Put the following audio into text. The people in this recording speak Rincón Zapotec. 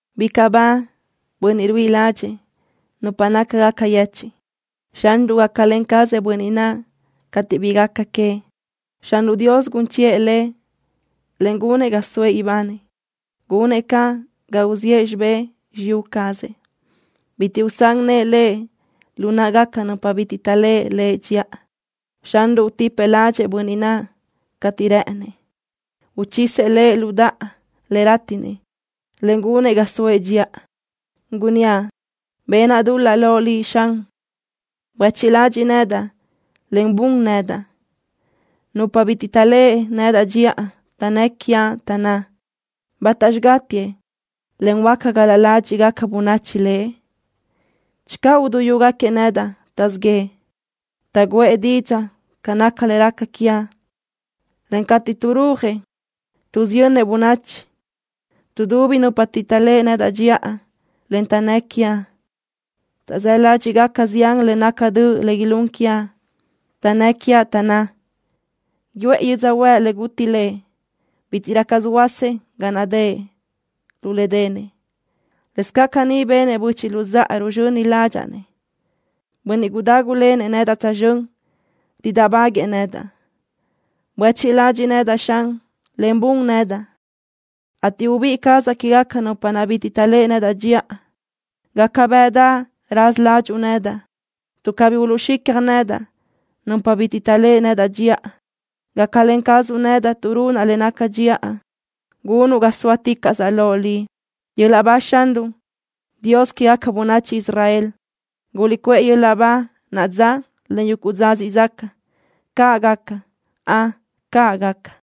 Bicaʼ ba bönniʼ ruíʼi ládxëʼë nupa nácagaca yechiʼ. Xanruʼ gácalen cazëʼ bönniʼ naʼ cateʼ bi gaca queëʼ. Xanruʼ Dios gun chiʼë lëʼ, en gunëʼ ga soëʼ ibanëʼ. Gunëʼ caʼ ga uziʼë xibé xiyú cazëʼ. Bitiʼ usán nëʼë lëʼ lu náʼagaca nupa bitiʼ taʼléʼe lëʼ dxiʼa. Xanruʼ utipëʼ ládxëʼë bönniʼ naʼ cateʼ réʼenëʼ. Uchisëʼ lëʼ lu daʼa le rátiʼnëʼ, en gunëʼ ga soëʼ dxiʼa. Gunníaʼ: Benaʼ dul-laʼ loʼ Liʼ, Xan. Buéchiʼ ladxiʼ nedaʼ, en bun nedaʼ. Nupa bitiʼ taʼléʼe nedaʼ dxiʼa taʼnnë́ quiaʼ, taʼnná: “¿Bátaxi gátiëʼ, en huáca gal-la ládxiʼgaca bönachi lëʼ?” Channö uduyúgaquiëʼ nedaʼ, taʼzíʼ yëʼë. Taʼgǘëʼ didzaʼ ca naca le raca quiaʼ, en cateʼ taʼrúajëʼ, tuʼsiyönnëʼ bönachi. Tuʼdubi nupa bitiʼ taʼléʼe nedaʼ dxiʼa, en taʼnnë́ quiaʼ. Taʼzáʼ ládxiʼgaca zián le naca döʼ le ilún quiaʼ. Taʼnnë́ quiaʼ, taʼnná: “Yuʼë yödzöhuë́ʼ le guti lëʼ. Bítiʼrö caz huöásëʼ ga naʼ dëʼ lu le denëʼ.” Lëscaʼ caní benëʼ böchiʼ luzáʼa ruzxöni ládxaʼa-nëʼ. Bönniʼ gudágulenëʼ nedaʼ tsözxö́n ridáʼbaguëʼë nedaʼ. Buéchiʼ ladxiʼ nedaʼ, Xan, en bun nedaʼ, ateʼ ubíʼi cazaʼ quégaca nupa naʼ bitiʼ taʼléʼe nedaʼ dxiʼa. Gácabeʼedaʼ raza ládxuʼu nedaʼ, tuʼ cabí uluʼxicja nedaʼ nupa bitiʼ taʼléʼe nedaʼ dxiʼa. Gáclen cazuʼ nedaʼ tuʼ runaʼ le naca dxiʼa. Gunuʼ ga sóaticaʼsaʼ loʼ Liʼ. ¡Yöl-laʼ ba Xanruʼ, Dios quégaca bönachi Israel! ¡Guliʼcuʼë yöl-laʼ ba naʼa dza, en yuguʼ dza siʼ zaca! ¡Caʼ gaca! ¡Ön, caʼ gaca!